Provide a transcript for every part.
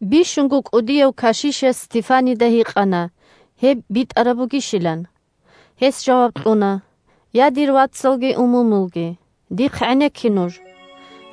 Бищунго кӀудияв кашишас Стефанида гьикъана гьеб битӀараб бугищилан. Гьес жаваб кьуна: – Я, дир вацалги умумулги! Дихъ гӀенекке нуж.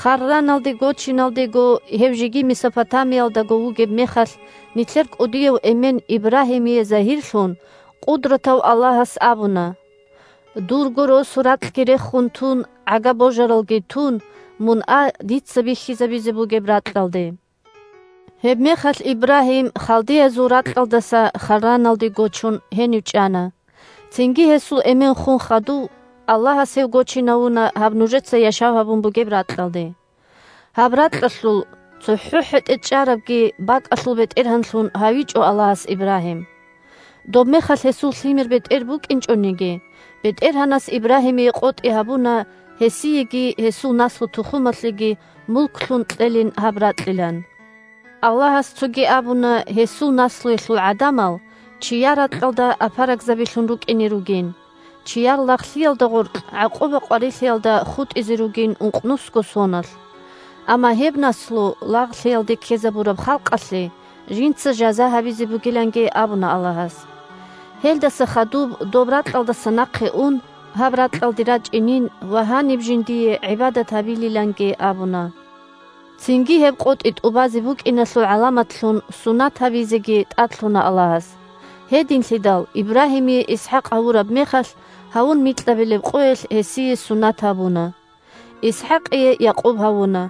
Харраналде гочиналдего, гьев жеги Месопотамиялдаго вугеб мехалъ, нилъер кӀудияв эмен Ибрагьимие загьирлъун, Къудратав Аллагьас абуна: «Дурго росу-ракьги рехун тун, гӀага-божаралги тун, мун а дица бихьизабизе бугеб ракьалде». Гьебмехалъ Ибрагьим, халдеязул ракьалдаса Харраналде гочун, гьенив чӀана. Цинги гьесул эмен хун хадув Аллагьас гьев гочинавуна гьаб нужеца яшав гьабун бугеб ракьалде. Гьаб ракьалъул цохӀо хӀетӀе чӀарабги бакӀалъул бетӀергьанлъун гьавичӀо Аллагьас Ибрагьим. Добмехалъ гьесул лъимер-бетӀер букӀинчӀониги, БетӀергьанас Ибрагьимие къотӀи гьабуна гьесиеги гьесул наслу-тухумалъеги мулклъун кьелин гьаб ракьилан. Аллагьас цоги абуна гьесул наслуялъул гӀадамал чияр ракьалда апарагзабилъун рукӀине ругин, чияр лагълъиялда гъоркь гӀакъуба-къварилъиялда хутӀизе ругин ункънусго соналъ. Амма гьеб наслу лагълъиялде ккезабураб халкъалъе жинца жаза гьабизе бугиланги абуна Аллагьас. Гьелдаса хадуб доб ракьалдаса нахъе ун, гьаб ракьалде рачӀинин ва гьаниб жиндие гӀибадат гьабилиланги абуна. Цинги гьеб къотӀи тӀубазе букӀиналъул гӀаламатлъун сунат гьабизеги тӀадлъуна Аллагьас. Гьединлъидал, Ибрагьимие ИсхӀакъ гьавураб мехалъ, гьавун микьабилеб къоялъ гьесие сунат гьабуна. ИсхӀакъие Якъуб гьавуна,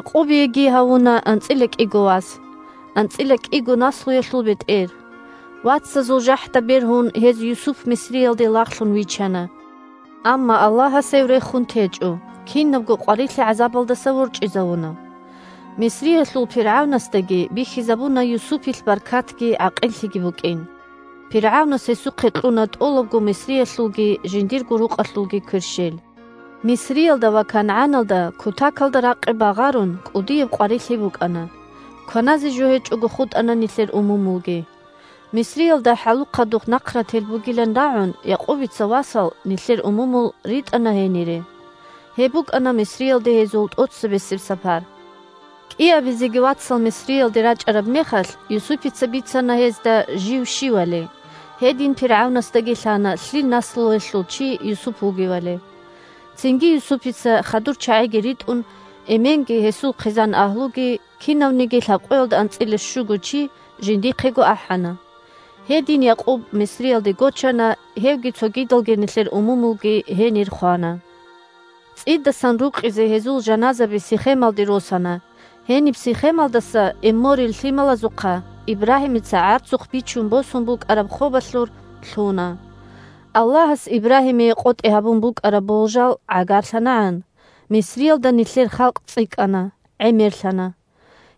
Якъубиеги гьавуна анцӀила кӀиго вас – анцӀила кӀиго наслуялъул бетӀер. Вацазул жахӀда бергьун гьез Юсуп Мисриялде лагълъун вичана. Амма Аллагьас гьев рехун течӀо, кинабго къварилъи-гӀазабалдаса ворчӀизавуна. Мисриялъул пиргӀавнасдаги бихьизабуна Юсупилъ баркатги гӀакъиллъиги букӀин. ПиргӀавнас гьесухъе кьуна тӀолабго Мисриялъулги жиндирго рукъалъулги кверщел. Мисриялда ва КангӀаналда, кутакалда ракъи багъарун, кӀудияб къварилъи букӀана. Кваназе жо гьечӀого хутӀана нилъер умумулги. Мисриялда хӀалухъадул нахърател бугилан рагӀун, Якъубица васал – нилъер умумул – ритӀана гьенире. (Гьеб букӀана Мисриялде гьезул тӀоцебесеб сапар.) КӀиабизеги вацал Мисриялде рачӀараб мехалъ Юсупица бицана гьезда жив щивали, гьедин пиргӀавнасдаги лъана лъил наслуялъул чи Юсуп вугевали. Цинги Юсупица, хадур чагӀиги ритӀун, эменги гьесул хъизан-агьлуги – кинавниги лъабкъоялда анцӀила щуго чи – жиндихъего ахӀана. Гьедин Якъуб Мисриялде гочана, гьевги цогидал нилъер умумулги гьенир хвана. ЦӀидасан рукъизе гьезул жаназаби Сихемалде росана, гьениб Сихемалдаса Эмморил лъималазухъа Ибрагьимица гӀарцухъ бичун босун букӀараб хобалъур лъуна. Аллагьас Ибрагьимие къотӀи гьабун букӀараб болжал гӀагарлъанагӀан Мисриялда нилъер халкъ цӀикӀкӀана, гӀемерлъана.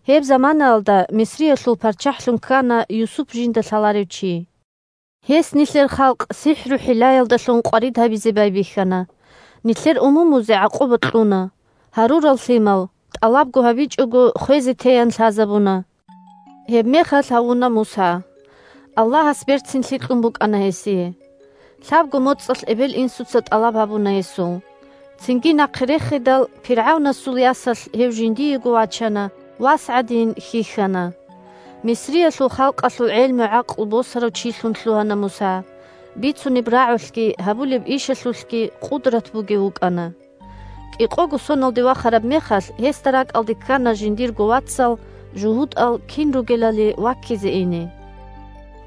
Гьеб заманаялда Мисриялъул парччахӀлъун ккана Юсуп жинда лъаларев чи. Гьес нилъер халкъ сихӀру-хӀиллаялдалъун къварид гьабизе байбихьана, нилъер умумузе гӀакъуба кьуна, гьарурал лъимал, тӀалабго гьабичӀого, хвезе теян лъазабуна. Гьебмехалъ гьавуна Муса. Аллагьас берцинлъи кьун букӀана гьесие. Лъабго моцӀалъ эбел-инсуца тӀалаб гьабуна гьесул. Цинги нахъе рехидал, пиргӀавнасул ясалъ гьев жиндиего вачана, вас гӀадин хьихьана. Мисриялъул халкъалъул гӀелму-гӀакълу босарав чилъун лъугьана Муса, бицунеб рагӀулъги гьабулеб ишалъулъги къудрат бугев вукӀана. КӀикъого соналде вахараб мехалъ гьесда ракӀалде ккана жиндирго вацал – жугьутӀал кин ругелали ваккизе ине.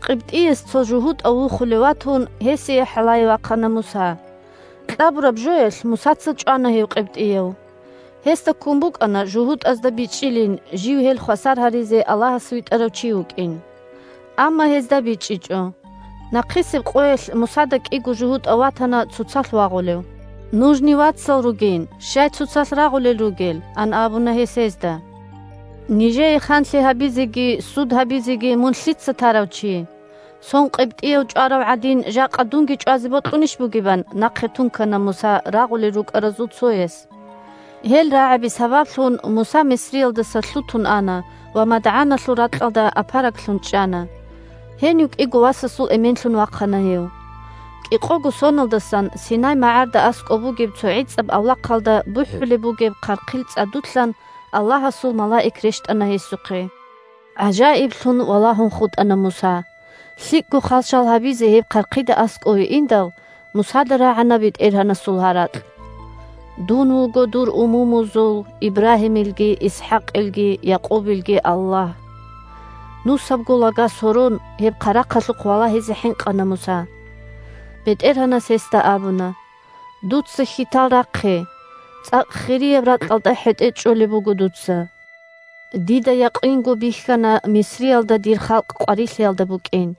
КъибтӀияс цо жугьутӀав вухулев ватун, гьесие хӀалае вахъана Муса. Кьабураб жоялъ Мусаца чӀвана гьев къибтӀияв. Гьесда ккун букӀана жугьутӀазда бичӀчӀилин жив гьел хвасар гьаризе Аллагьас витӀарав чи вукӀин. Амма гьезда бичӀчӀичӀо. Нахъисеб къоялъ Мусада кӀиго жугьутӀав ватана цоцалъ вагъулев. «Нужни вацал ругин, щай цоцалъ рагъулел ругел?» – ан абуна гьес гьезда. «Нижее ханлъи гьабизеги суд гьабизеги мун лъица тарав чи? Сон къибтӀияв чӀварав гӀадин, жакъа дунги чӀвазе бокьунищ бугеб?» – ан нахъе тункана Муса рагъулел рукӀаразул цояс. Гьел рагӀаби сабаблъун Муса Мисриялдаса лъутун ана ва МадгӀаналъул ракьалда апараглъун чӀана. Гьенив кӀиго васасул эменлъун вахъана гьев. КӀикъого соналдасан Синай магӀарда аскӀоб бугеб цо гӀицӀаб авлахъалда бухӀулеб бугеб хъархъил цӀадулъан Аллагьасул малаик рещтӀана гьесухъе. ГӀажаиблъун валагьун хутӀана Муса. ЛъикӀго хал-шал гьабизе гьеб хъархъида аскӀове индал, Мусада рагӀана БетӀергьанасул гьаракь: «Дун вуго дур умумузул: Ибрагьимилги, ИсхӀакъилги, Якъубилги Аллагь». Нусабго лага сорон, гьеб хъарахъалъухъ валагьизе хӀинкъана Муса. БетӀергьанас гьесда абуна: «Дуца хьитал рахъе. ЦӀакъ хирияб ракьалда хӀетӀе чӀолеб буго дуца. Дида якъинго бихьана Мисриялда дир халкъ къварилъиялда букӀин.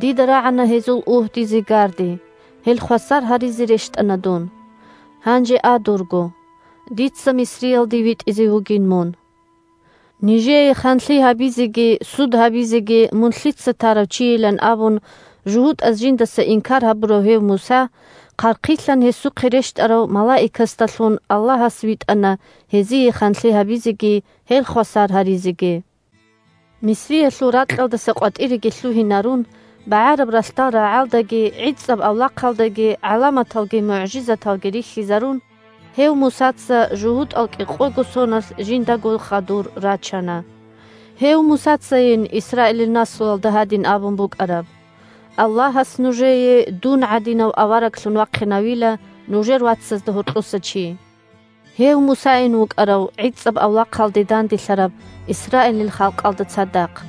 Дида рагӀана гьезул угьди-зигарди. Гьел хвасар гьаризе рещтӀана дун. Гьанже а дурго, дица Мисриялде витӀизе вугин мун!» Нижее ханлъи гьабизеги суд гьабизеги мун лъица тарав чийилан абун жугьутӀаз жиндаса инкар гьабурав гьев Муса, хъархъилъан гьесухъе рещтӀарав малаикасдалъун Аллагьас витӀана гьезие ханлъи гьабизеги, гьел хвасар гьаризеги. Мисриялъул ракьалдаса къватӀиреги лъугьинарун, БагӀараб ралъдал рагӀалдаги гӀицӀаб авлахъалдаги гӀаламаталги мугӀжизаталги рихьизарун, гьев Мусаца жугьутӀал кӀикъого соналъ жиндаго хадур рачана. Гьев Мусацайин Исраилил наслуялда гьадин абун букӀараб: «Аллагьас нужее дун гӀадинав авараглъун вахъинавила нужер вацазда гьоркьоса чи». Гьев Мусайин вукӀарав гӀицӀаб авлахъалде данделъараб Исраилил халкъалда цадахъ.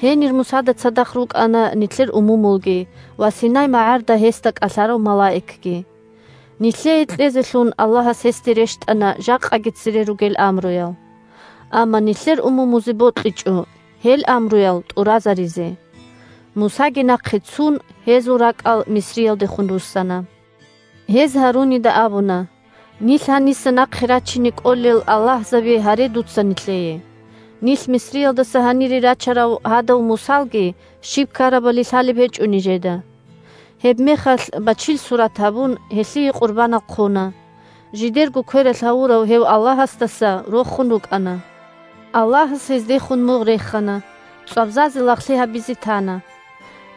Гьенир Мусада цадахъ рукӀана нилъер умумулги ва Синай магӀарда гьесда кӀалъарав малаикги. Нилъее кьезелъун Аллагьас гьесде рещтӀана жакъаги цере ругел амруял. Амма нилъер умумузе бокьичӀо гьел амруял тӀуразаризе. Мусаги нахъе цун, гьезул ракӀал Мисриялдехун руссана. Гьез Гьарунида абуна: «Нилъ гьаниса нахъе рачине кӀолел аллагьзаби гьаре дуца нилъее. Нилъ Мисриялдаса гьанире рачарав гьадав Мусалги щиб ккарабали лъалеб гьечӀо нижеда». Гьебмехалъ, бачил сурат гьабун, гьелъие къурбанал хъуна. Жидерго квералъ гьавурав гьев «аллагьасдаса» рохун рукӀана. Аллагьас гьездехун мугъ рехана, цӀвабзазе лагълъи гьабизе тана,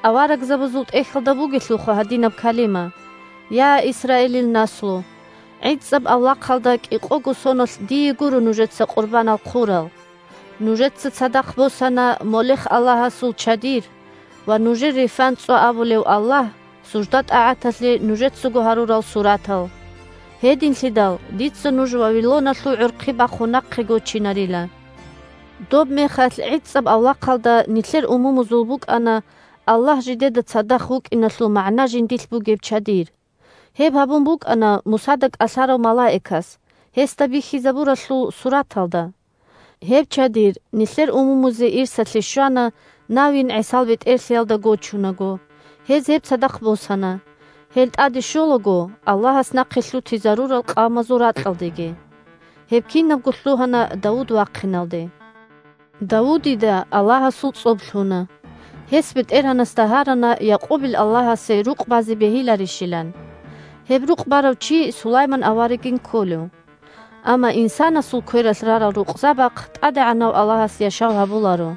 Аварагзабазул ТӀехьалда бугелъулха гьадинаб калима: «Я, Исраилил наслу! ГӀицӀаб авлахъалда кӀикъого соналъ дие гуро нужеца къурбанал хъурал! Нужеца цадахъ босана Молех-аллагьасул чадир ва нужер Рефан-цӀва абулев „аллагь“ – сужда-тӀагӀаталъе нужецаго гьарурал суратал. Гьединлъидал дица нуж Вавилоналъул гӀорхъи бахун нахъе гочинарила». Добмехалъ гӀицӀаб авлахъалда нилъер умумузул букӀана Аллагь жидеда цадахъ вукӀиналъул магӀна жиндилъ бугеб чадир. Гьеб гьабун букӀана Мусада кӀалъарав малаикас гьесда бихьизабуралъул сураталда. Гьеб чадир нилъер умумузе ирсалъе щвана Навин ГӀисал бетӀерлъиялда гочунаго, гьез гьеб цадахъ босана, гьел тӀаде щолаго Аллагьас нахъе лъутизарурал къавмазул ракьалдеги. Гьеб кинабго лъугьана Давуд вахъиналде. Давудида Аллагьасул цӀоб лъуна. Гьес БетӀергьанасда гьарана Якъубил Аллагьасе рукъ базе бегьиларищилан. Гьеб рукъ барав чи Сулайман аварагин кколев. Амма инсанасул квералъ рарал рукъзабахъ ТӀадегӀанав Аллагьас яшав гьабуларо.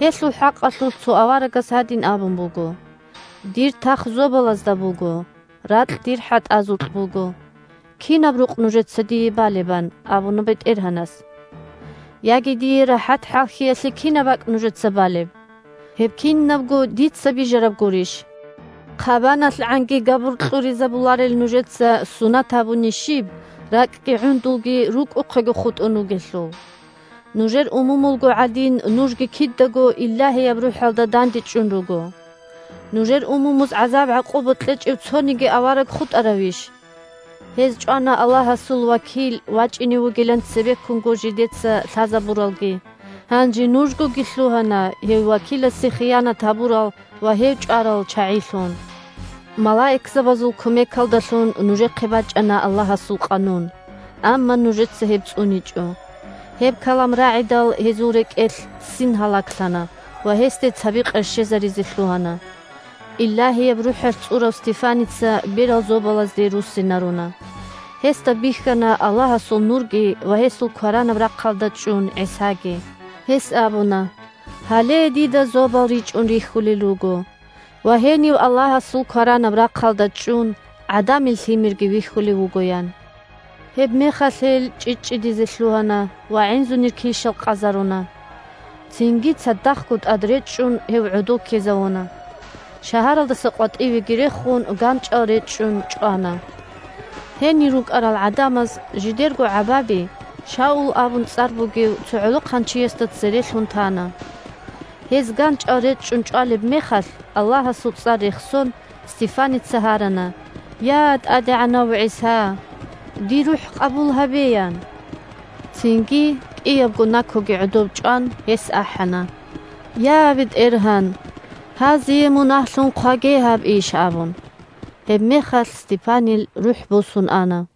Гьелъул хӀакъалъулъ цо аварагас гьадин абун буго: «Дир тах зобалазда буго. Ракь Дир хӀатӀазукь буго. Кинаб рукъ нужеца Дие балеб? – ан абуна БетӀергьанас. – Яги Дие рахӀат-хӀалхьиялъе кинаб бакӀ нужеца балеб? Гьеб кинабго Дица бижараб гурищ?» ХъабаналъгӀанги габур кьуризабуларел нужеца сунат гьабуни щиб, ракӀги гӀундулги рукӀухъего хутӀун ругелъул? Нужер умумулго гӀадин, нужги кидаго Илагьияб РухӀалда дандечӀун руго. Нужер умумуз гӀазаб-гӀакъуба кьечӀев цониги авараг хутӀаравищ? Гьез чӀвана Аллагьасул вакил вачӀине вугилан цебеккунго жидеца лъазабуралги. Гьанже нужгоги лъугьана гьев вакиласе хиянат гьабурал ва гьев чӀварал чагӀилъун. Малаикзабазул кумекалдалъун нужехъе бачӀана Аллагьасул къанун, амма нужеца гьеб цӀуничӀо! Гьеб калам рагӀидал гьезул рекӀелъ ццин гьалаглъана ва гьесде цаби къерщезаризе лъугьана. Илагьияб РухӀалъ цӀурав Стефаница берал зобалазде руссинаруна. Гьесда бихьана Аллагьасул нурги ва гьесул кваранаб рахъалда чӀун ГӀисаги. Гьес абуна: – Гьале дида зобал ричӀун рихьулел руго ва гьенив Аллагьасул кваранаб рахъалда чӀун ГӀадамил Лъимерги вихьулев вуго! – ян. Гьебмехалъ гьел чӀчӀичӀчӀидизе лъугьана ва гӀинзунир килщал къазаруна. Цинги цадахъго тӀадречӀчӀун гьев гӀодов ккезавуна, шагьаралдаса къватӀивеги рехун, ганчӀал речӀчӀун чӀвана. Гьенир рукӀарал гӀадамаз жидерго гӀабаби Шаул абун цӀар бугев цо гӀолохъанчиясда цере лъун тана. Гьез ганчӀал речӀчӀун чӀвалеб мехалъ, Аллагьасул цӀар рехсон, Стефаница гьарана: – Я, ТӀадегӀанав ГӀиса! Дир рухӀ къабул гьабе! – ян. Цинги, кӀиябго накуги гӀодоб чӀван, гьес ахӀана: – Я, БетӀергьан! Гьазие мунагьлъун хъваге гьаб иш! – абун. Гьебмехалъ Стефанил рухӀ босун ана.